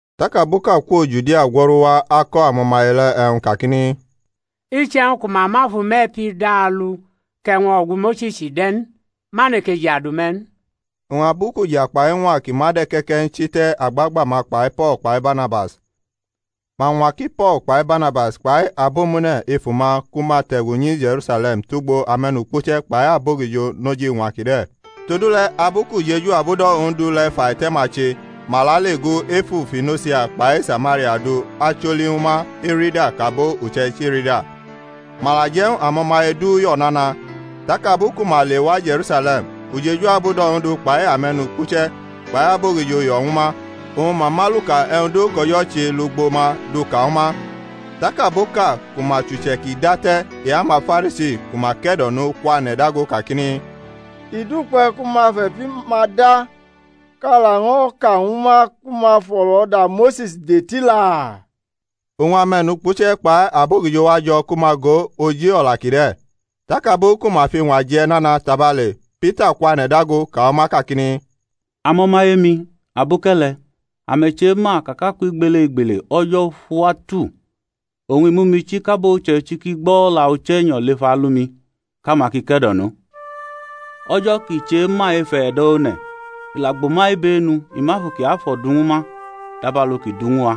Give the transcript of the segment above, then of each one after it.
Tak aboʼka kwo Judia gwo̩ru wa ako̩ amo̩maye le̩ e̩wñ kakini, Iche̩wñ ku ma ma fʼume̩ e̩pi da alu kʼe̩wʼñ o̩gu Mose̩s de̩ n ma neke jadu me̩ n. Oñ abu kʼuja kpai iñwa ki ma de̩ ke̩ke̩ n chi te̩ agbagba-ma kpai Po̩l kpai Barnabas, ma ñwa ki Po̩l kpai Barnabas kpai abomune̩ ef uma ku ma te̩gu nyi Je̩rusale̩m tugbo ame̩nukpuche̩ kpai abogijo noj iñwa kide̩. Todule̩ abu kʼujeju abudo̩ Ondu le̩ fʼaite̩-ma che ma lale gu efu Fonisia kpai Samaria du acholi ñwu ma erida kʼabo uche̩ichi rida. Ma la je̩ ñw amo̩maye du yo̩ nana. Tak abu ku ma lewa Je̩rusale̩m, ujeju abudo̩ Ondu kpai ame̩nukpuche̩ kpai abogijo yo̩ ñwu ma, oñ ma mʼaluka e̩wñ du kʼO̩jo̩ che lugbo ma duka ñwu ma. Tak abo ʼka ku ma chʼuche̩ ki date̩ e-amaFarisi ku ma ke̩do̩no kwane̩ dago kakini, I dukpe̩ ku ma fe̩pi-ma da, kʼa laño̩ ka ñwu ma ku ma fʼo̩lo̩da Mose̩s de tila. Oñ ame̩nukpuche̩ kpai abogijo wa jo̩ ku ma go oji o̩la kide̩. Tak abu ku ma fʼiñwa je̩ nana tabale Pita kwane̩ dago ka ñwu ma kakini, Amo̩maye-mi, aboke̩le̩, ame̩ chema ka kʼakwʼigbelegbele O̩jo̩ fʼuwa tu oñ i mʼumi chi kʼabo uche̩ichi ki gbo̩ o̩la Uche̩nyo̩ lef alu-mi kʼama ki ke̩do̩no. O̩jo̩ kʼi chema ef e̩do̩ one̩, la gbʼuma ibenu, i mʼAfu Kiafo̩ du ñwu ma dabalu kʼi du ñw a.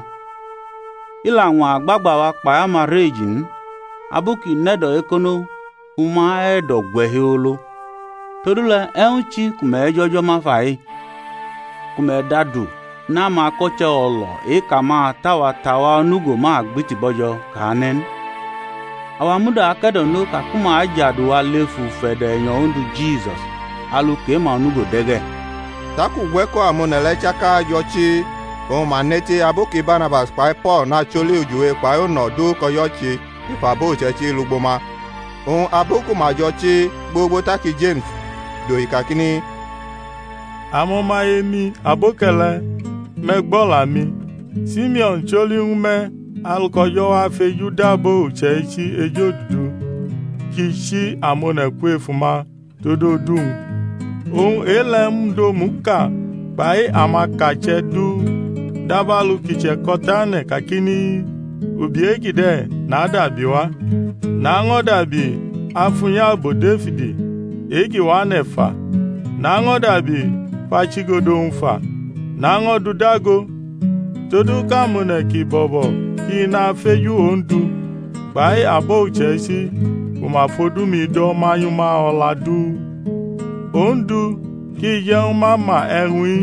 I la ñwa agbagba awa kpai ama rʼeji n abu kʼi nʼe̩do̩ ekono fʼuma e̩do̩ gwe̩ hiolo. Todule̩, e̩wñ chi ku me̩ jʼO̩jo̩ ma fa-i, ku me̩ dʼadu nʼamako̩che̩ o̩lo̩ e-kʼamata-wa tʼawa onugo ma gbiti bo̩jo̩ kʼa ne̩ n? Awa muda ake̩do̩no ka ku ma ajadu wa lef ufe̩do̩ e̩nyo̩ Ondu Jisus, alu kʼe-ma onugo de̩ ge̩. Tak ugwe̩ko̩ amone̩ le̩ chaka jo̩ chii, oñ ma neti abu ki Barnabas kpai Po̩l nacholi ujiwe kpai uno̩ du kʼO̩jo̩ che ef abo uche̩ichi lugbo ma. Oñ abu ku ma jo̩ chii gbogbo taki Jeme̩s dohi kakini, Amo̩maye-mi aboke̩le̩, me̩ gbʼo̩la-mi. Simeo̩n choli ñwu me̩ alu kʼO̩jo̩ wa fejudʼabo uche̩ichi ejodudu kʼi chi amone̩ kwef uma tod odu-wñ. Oñ e-le̩ mud omuʼka kpai amakache̩ du; dabalu ki che̩ko̩tane̩ kakini, Ubi e-kide̩ nadabiwa, naño̩ dabi afʼunyabo Defid e-ki wane̩ fa; naño̩ dabi fʼachigodo-wñ fa, naño̩ dʼu dago, todu kʼamone̩ ki bo̩bo̩ ki nafeju Ondu, kpai abo uche̩ichi ku ma fʼodu-mi do̩ manyʼuma o̩la du, Ondu, kʼi je̩ ñwu ma ma e̩wñ-i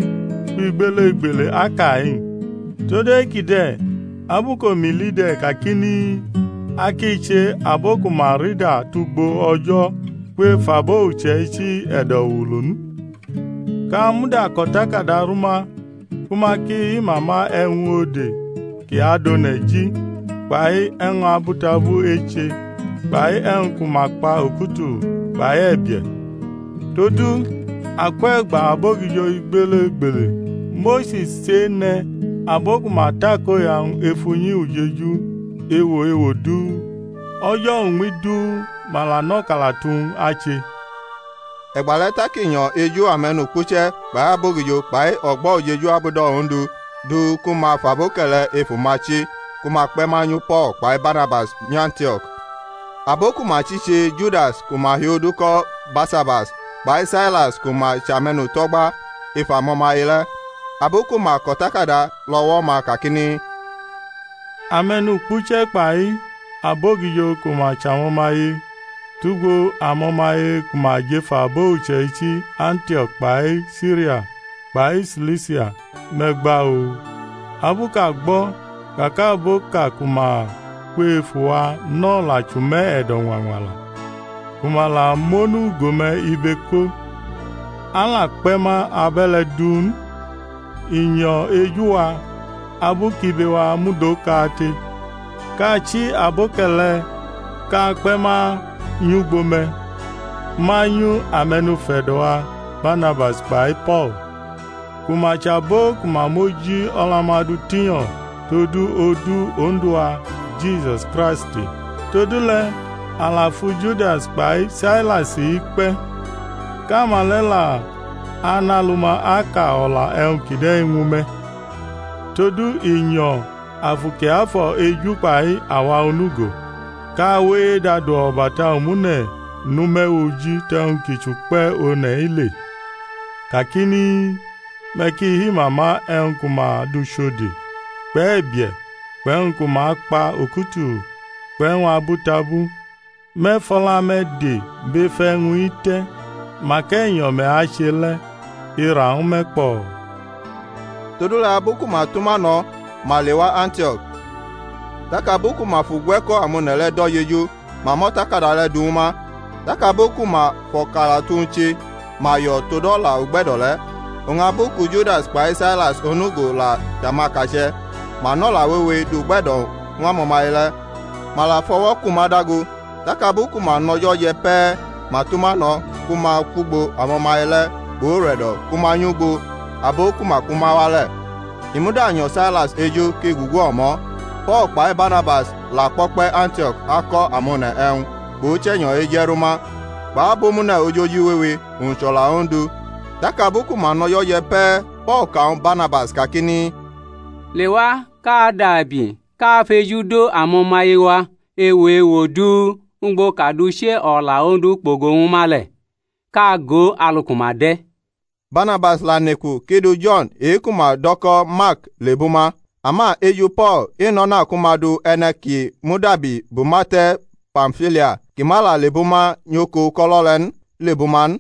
kwʼigbelegbele aka-i. Todu kide̩ abu kʼomi li de̩ kakini, A ki che abo ku ma rida tugbo O̩jo̩ kwef abo uche̩ichi e̩do̩wulu n; kʼa muda kʼo̩takada rʼuma ku ma ki hi-mama e̩wñ ode ki adʼone̩ ji kpai e̩wñ abutabu eche kpai e̩wñ ku ma kpa okutulu kpai e̩bie̩. Todu akwʼe̩gba abogijo igbelegbele Mose̩s chene̩ abo ku ma takoya-wñ ef unyi ujeju ewo ewo du, o̩jo̩ uñmi du ma la nʼo̩kalatu-wñ ache. E̩gba le̩ tak i nyo̩ eju ame̩nukpuche̩ kpai abogijo kpai o̩gbo̩ ujeju abudo̩ Ondu du ku ma fʼaboke̩le̩ ef uma chi ku ma kpe̩ manyu Po̩l kpai Barnabas nyʼAntio̩k. Abo ku ma chi che Judas ku ma hiodu ko̩ Barsabas kpai Sailas ku ma chʼame̩nuto̩gba ef amo̩maye le̩: abu ku ma kʼo̩takada lʼo̩wo̩-ma kakini, Ame̩nukpuche̩ kpai abogijo ku ma chʼamo̩maye, tugbo amo̩maye ku ma jʼef abo uche̩ichi Antio̩k kpai Siria, kpai Silisia, me̩ gba-o. Abu kʼa gbo̩ ka kʼaboʼka ku ma kwefu wa nʼo̩la chʼume̩ e̩do̩ ñwañwala, ku ma la mʼonugo-me̩ ibe ko, a la kpe̩ ma abe̩le̩ duu n; i nyo̩ eju-wa abu kʼibe-wa mud okate, kʼa chi aboke̩le̩ kʼa kpe̩ ma nyugbo me̩, manyu ame̩nufe̩do̩-wa Barnabas kpai Po̩l, ku ma chʼabo ku ma mʼoji o̩la-ma du tinyo̩ todu odu Ondu-wa Jisus Kraist. Todule̩ a la fu Judas kpai Sailas-i kpe̩, kʼama le̩ la anʼalu-ma aka o̩la e̩wñ kide̩ ñwu me̩. Todu i nyo̩ Afu Kiafo̩ eju kpai awa onugo, kʼa we edʼadu o̩bata omune̩ nʼume̩ oji tʼe̩wñ ki chʼukpe̩ one̩-i le: kakini, Me̩ ki himama e̩wñ ku ma du chʼode̩ kpʼe̩bie̩ kpʼe̩wñ ku ma kpa okutulu kpʼe̩wñ abutabu; me̩ fʼo̩la-me̩ de bʼef e̩wñ-i te̩ mak e̩nyo̩ me̩ ache le̩. I ra ñw me̩ kpo̩o̩. Todule̩ abu ku ma tʼuma no̩ ma lewa Antio̩k; tak abu ku ma fʼugwe̩ko̩ amone̩ le̩ do̩ jeju ma mʼo̩takada le̩ du ñw ma. Tak abu ku ma fʼo̩kalatu-wñ che ma yo̩ tod o̩la ugbe̩do̩ le̩. Oñ abu ku Judas kpai Sailas onugo la chʼamakache̩, ma nʼo̩la wewe du-gbe̩do̩ ñw amo̩maye le̩, ma la fʼo̩wo̩ kʼuma dago. Tak abu ku ma nʼo̩jo̩ je̩ pe̩ ma tʼuma no̩ ku ma kwʼugbo amo̩maye le̩ kpʼure̩do̩ ku ma nyʼugbo abo ki kpʼuma wa le̩. [ I muda nyo̩ Sailas eju kʼi gugu omo̩.] Po̩l kpai Barnabas la kpo̩kpe̩ Antio̩k ako̩ amone̩ e̩wñ kpʼUche̩nyo̩ eje̩ ru ma kpʼabomune̩ ojoji wewe, owñ chʼo̩la Ondu. Tak abu ku ma nʼo̩jo̩ je̩ pe̩ Po̩l ka ñw Barnabas kakini, Lewa kʼa dabi kʼa fejudʼamo̩maye-wa ewo ewo du ugbo kʼa dʼuche̩ o̩la Ondu kpogo ñw ma le̩, kʼa go alu ku ma de̩. Barnabas la neku kʼi du Jo̩n e-ku ma dʼo̩ ko̩ Mark le̩ lebʼuma; ama eju Po̩l i nʼo̩na ku ma du e̩ne̩ ki mudabi bʼuma te̩ Pamfilia, kʼi ma lebʼuma nyʼoko uko̩lo̩ le̩ n, lebʼuma n.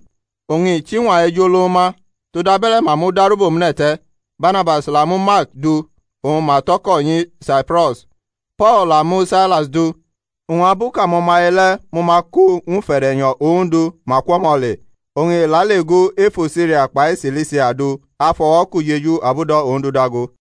Oñ i chʼiñwa ej olo ñw ma, todabe̩le̩ ma mudaru bʼomune̩ te̩, Barnabas la mu Mark du oñ ma tʼo̩ko̩ nyi Saipro̩s. Po̩l la mu Sailas du, oñ abu kʼamo̩maye le̩ mʼuma ko ñw ufe̩de̩nyo̩ Ondu, ma kwʼo̩mo̩ le. Oñ i leale gu efu Siria kpai Silisia du afʼo̩wo̩ kʼujeju ujeju abudo̩ Ondu dago.